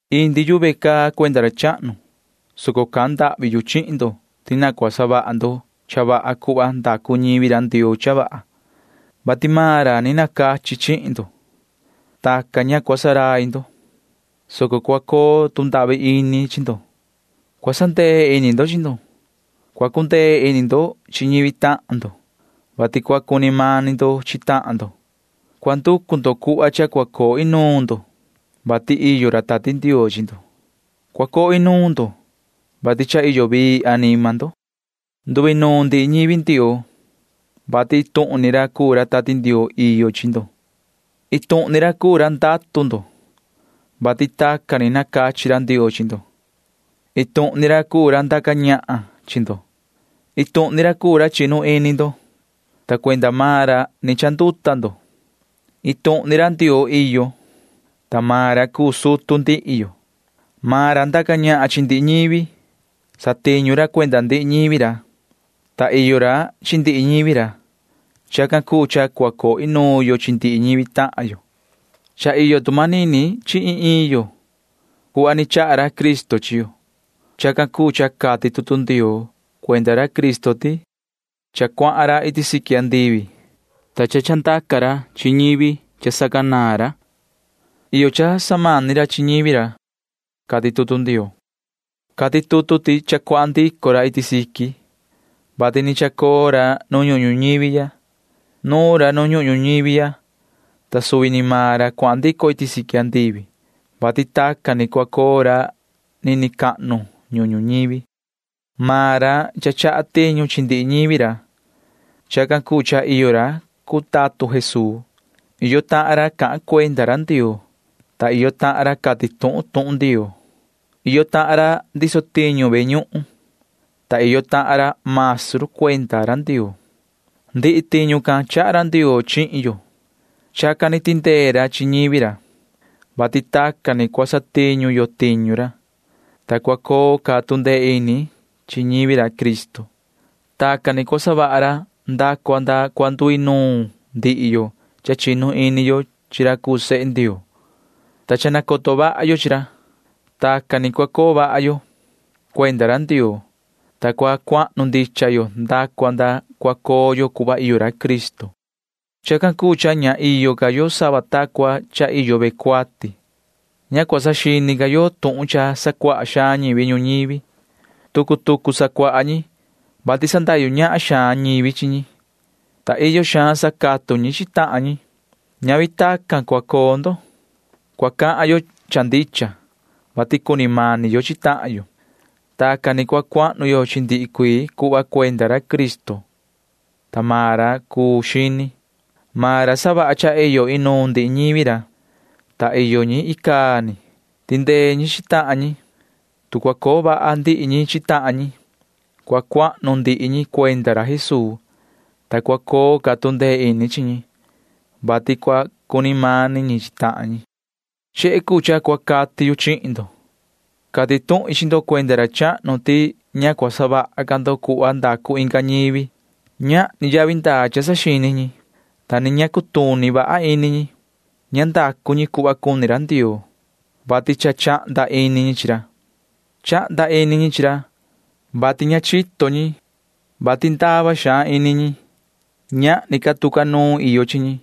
Indi yu ve caa cuenda ra chahnu, soco cahan ndahvi yu chihin ndo ti na cua savaha ndo cha vaha cuhva ndacu ñivi ra Ndioo cha vaha, vati ni nacachi maan ra chihin ndo. Tacan ni ña cua ndurai ndo, soco cua coo tu ndahvi ini chi ndo. Cua sandee ini ndo chi ndo. Cua cundee ini ndo chi ñivi tahan ndo, vati cua cuni mani ndo chi tahan ndo. Cua nducu ndo cuhva cha cua coo inuun ndo, vati iyo ra Tati Ndioo chi ndo. Cua coo inuun ndo, vati cha iyo vii anima ndo. Nduinuun ndihi ñivi Ndioo, vati iin tuhun ni ra cuu ra Tati Ndioo iyo chi ndo. Iin tuhun ni ra cuu ra ndatu ndo, vati tacan ni nacachi ra Ndioo chi ndo. Iin tuhun ni ra cuu ra ndaca ñahan chi ndo. Iin tuhun ni ra cuu ra chinu ini ndo, ta cuenda maan ra ni chanduta ndo. Iin tuhun ni ra Ndioo iyo, ta maan ra cuu sutu ndihi yo. Maan ra ndaca ñahan chi ndihi ñivi ra. Satiñu ra cuenda ndihi ñivi ra, ta iyo ra chi ndihi ñivi ra. [Chacan cuu cha cua coo inuun yo chi ndihi ñivi tahan yo.] Cha iyo tu manini chi ta iin ta iin yo cuhva ni chaha ra Cristo chi yo. Chacan cuu cha cati tutu Ndioo [cuenda ra Cristo] ti: Cha ndaa ra iti siqui andivi, ta ni chandaca ra chi ñivi cha sacanaan ra. Iyo cha samani ra chi ñivi ra, cati tutu Ndioo. Cati tutu can ti cha ndaa ra iti siqui, vati ni nuun xihna ra nu ñuhun ñuñivi ya. Nuun ra nu ñuhun ñuñivi ya, ta ini rai cuu ra ni ndaa iti siqui andivi, vati tacan ni cua coo ra nini cahnu ñuhun ñuñivi. Iyo tiñu cha samani ra chi ndihi ñivi ra. Chacan cuu cha iyo ra cuu tatun Jesuu. Iyo tahan ra cahan cuenda ra Ndioo, ta iyo tahan ra cati tuhun tuhun Ndioo. Iyo tahan ra ndiso tiñu ve ñuhun, ta iyo tahan ra maestru cuenda ra Ndioo. Ndihi tiñu can chaha ra Ndioo chihin yo. Chacan ni tindee ra chi ñivi ra, vati tacan ni cua satiñu yo tiñu ra, ta cua coo ca tu ndee ini chi ñivi ra Cristo. Tacan ni cua savaha ra nda cua nda cua nduinuun ndihi yo cha chinu ini yo chi ra cuu sehe Ndioo, ta cha nacoto vaha yo chi ra. Tacan ni cua coo vaha yo cuenda ra Ndioo, ta cua cuahnu ndicha yo nda cua nda cua coo yo cuhva iyo ra Cristo. Chacan cuu cha ña iyo ca yo sava ni ta cua iyo ve cuati. Ña cua saxini ca yo tuhun cha sacuaha xaan ñivi ñuñivi. Tucu tucu sacuaha ñi, vati sandahyu ñahan xaan ñivi chi ñi, ta iyo xaan sacatu ñi chi tahan ñi. Ñavi tacan ni cua coo ndo. Cua cahan yo cha ndicha, vati cuni mani yo chi tahan yo. Tacan ni cua cuahnu yo chi ndihi cuii cuhva cuenda ra Cristo, ta maan ra cuu xini. Maan ra savaha cha iyo inuun ndihi ñivi ra, ta iyo ñi icaa ni. Tindee ñi chi tahan ñi. Tu cua coo vaha ndihi ñi chi tahan ñi, cua cuahnu ndihi ñi cuenda ra Jesuu, ta cua coo ca tu ndee ini chi ñi, vati cua cuni mani ñi chi tahan ñi. Chehe cuu cha cua cati yu chihin ndo. Cati tuhin chi ndo cuenda ra chahnu ti ña cua savaha ca ndo cuhva ndacu ñivi cuu inga ñivi. Ñahni yavi ndaa cha saxini ñi, ta ni ña cutuni vaha ini ñi. Ña ndacu ñi cuhva cuni ra Ndioo, vati cha chahnda ini ñi chi ra. Chahnda ini ñi chi ra, vati ña chito ñi, vati ndava xaan ini ñi. Ñahni ca tu ca nuun iyo chi ñi,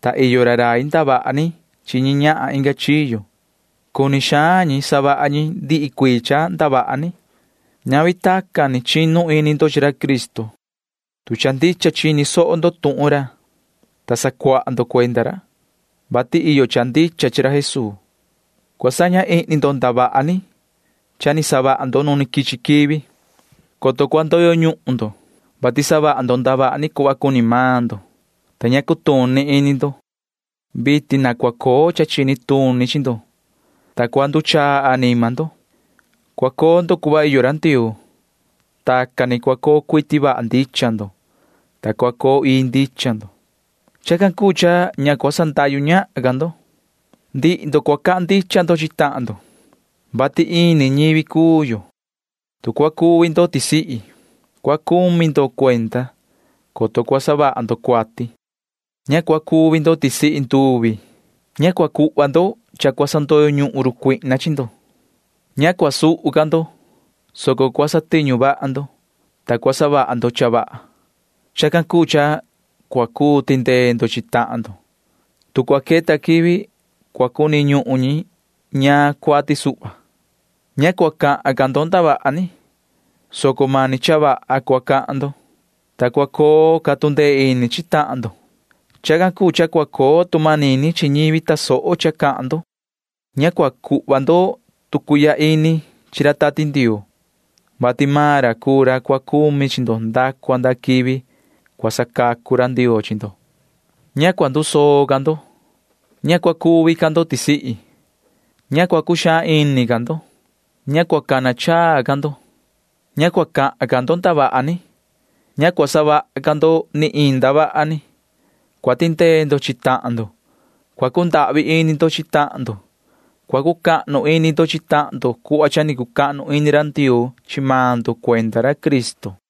ta iyo ra rai ndavaha ni chi ñi ñahan inga chiyo. Cuni xaan ñi savaha ñi ndihi cuii cha ndavaha ni. Ñavi tacan ni chinu ini ndo chi ra Cristo, tu cha ndicha chini soho ndo tuhun ra, ta sacuaha ndo cuenda ra, vati iyo cha ndicha chi ra Jesuu. Cua saña ihni ndo ndavaha ni cha ni savaha ndo nu quichi quivi. Cha cua ndoyo ñuhun ndo, vati savaha ndo ndavaha ni cuhva cuni maan ndo, ta ña cutuni ini ndo. Vitin na cua coo cha chini tuni chi ndo, ta cua nduchaa anima ndo. Cua coo ndo cuhva iyo ra Ndioo. Tacan ni cua coo cuiti vaha ndicha ndo, ta cua coo ii ndicha ndo. Chacan cuu cha ña cua sandahyu ñahan ca ndo. Ndihi ndo cua cahan ndo cha ndicha chi tahan ndo, vati ini ñivi cuu yo. Tu cua nduxaan ndo, cua saha ndo cuenda, coto cua savaha ndo cuati. Ña cua nduxaan nahan ndo. Ña cua cuhva ndo nuun cua sandoyo ñuhun run cuihna chi ndo. Ña cua suhu ca ndo, soco cua satiñu vaha ndo, ta cua savaha ndo cha vaha. Chacan cuu cha cua cuu tindee ndo chi tahan ndo, tu cua queta quivi cua cuni ñuhun ñi ñaan cuati suhva. Ña cua cahan ca ndo ndavaha ni, soco mani cha vaha cua cahan ndo, ta cua coo ca tu ndee ini chi tahan ndo. Chacan cuu cha cua coo tu manini chi ñivi tasoho cha cahan ndo. Ña cua cuhva ndo tu cuihya ini chi ra Tati Ndioo, vati maan ra cuu ra cua cumi chi ndo nda cua nda quivi cua sacacu ra Ndioo chi ndo. Ña cua ndusoo ca ndo. Ña cua cuvi ca ndo tisihi. Ña cua cuxaan ini ca ndo. Ña cua cuvaa ca ndo. Ña cua cahan ca ndo ndavaha ni. Ña cua savaha ca ndo ni iin ndavaha ni. Cua tindee ndo chi tahan ndo. Cua cundahvi ini ndo chi tahan ndo. Cua cucahnu ini ndo chi tahan ndo cuhva cha ni cucahnu ini ra Ndioo chi maan ndo cuenda ra Cristo.